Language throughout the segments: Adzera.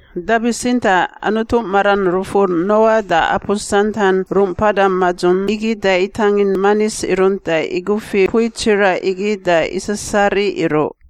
Da bitsintaꞌ Anutu maran rufur Noa da apu santan rungꞌ mpada madzung igi da itangin manis irunt da igufi mpui tsiraꞌ igi da isasariꞌ iruꞌ.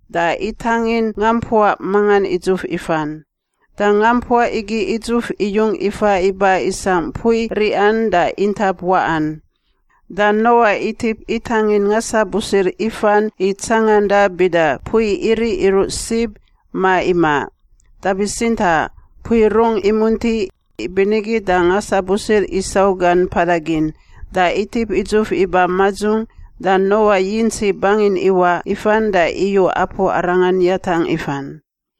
da itangin ngampuaꞌ mangan idzuf ifan. Da ngampuaꞌ igi idzuf iyung ifa iba isangꞌ mpui riꞌan da intap waꞌan. Da Noa itip itangin ngasabusir ifan i tsanganda bida mpui iriꞌ iruꞌ sib, ma imaꞌ. Da bitsintaꞌ mpui rungꞌ imunti, ibinigi da ngasabusir isau gan mpada gin, da itip idzuf iba madzung da Noa yintsi bangin iwaꞌ ifan da iyu apu arangan yatangꞌ ifan.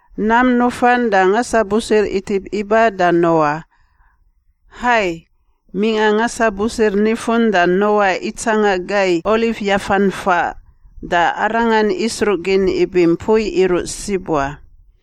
Nam nufan da ngasabusir itip iba da Noa. Hai, mingꞌa ngasabusir nifun da Noa itsanga gai olif yafan faꞌ, da arangan isruꞌgin ibi mpui iruꞌ sib wa.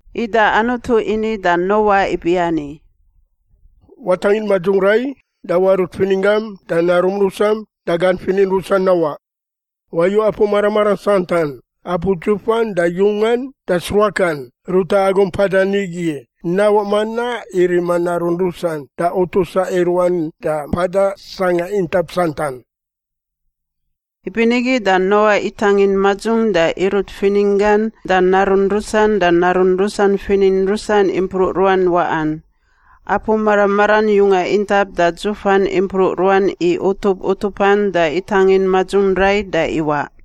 Ida Anutu ini da Noa ibiani, “Watangin madzung rai da warut fininggam da narum rusam da gan finin rusan nawaꞌ. Wayu apu mara maran santan, apu dzufan da yungan da sruakan, ruta agu mpadan igi nawaꞌ manaꞌ i rima narun rusan da utusa i ruan da mpada sangꞌa intap santan.” Ibinigi da Noa itangin madzung da irut fininggan da narun rusan da narun rusan finin rusan impruꞌ ruan waꞌan. Apu mara maran yunga intap da dzufan impruꞌ ruan i utup utupan da itangin madzung rai da iwaꞌ.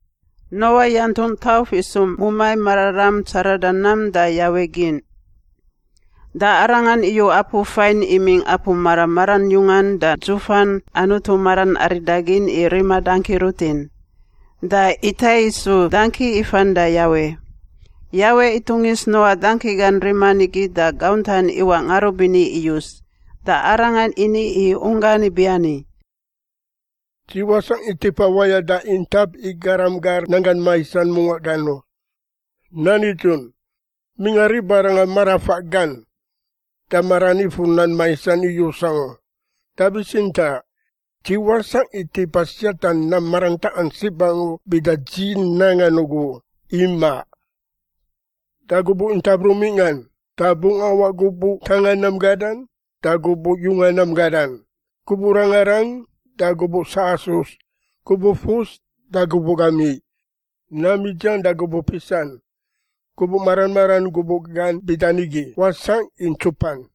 Noa yantungꞌ tauf isu mumai mararam tsarada nam da Yawe gin. Da arangan iyu apu fain imingꞌ apu mara maran yungan da dzufan Anutu maran aridagin i rima dangki rutin, da itai isu dangki ifan da Yawe. Yawe itungis Noa dangki gan riman igi da gauntan iwaꞌ ngarubini iyus, da Arangan ini i unggan ibiani, “Dzi wasangꞌ i tipa wayada intap i garam gar nanggan maisan mungaꞌ gan u. Nan nidzun, mingꞌa ribarangan marafaꞌ gan da maran ifur nam maisan iyus angu, da bitsintaꞌ dzi wasangꞌ i tipa siata nam marantaꞌan sib angu bida dzi nangan ugu u, imaꞌ. “Da gubuꞌ intap rungꞌ mingꞌan, da bungꞌ awaꞌ gubuꞌ ntanga nam gadan da gubuꞌ yunga nam gadan, gubuꞌ rangarang da gubuꞌ sasus, gubuꞌ fus da gubuꞌ gamiꞌ, nam idziang da gubuꞌ pisan. Gubuꞌ mara maran gubuꞌ gan bida nigi wasangꞌ i ntsupan.”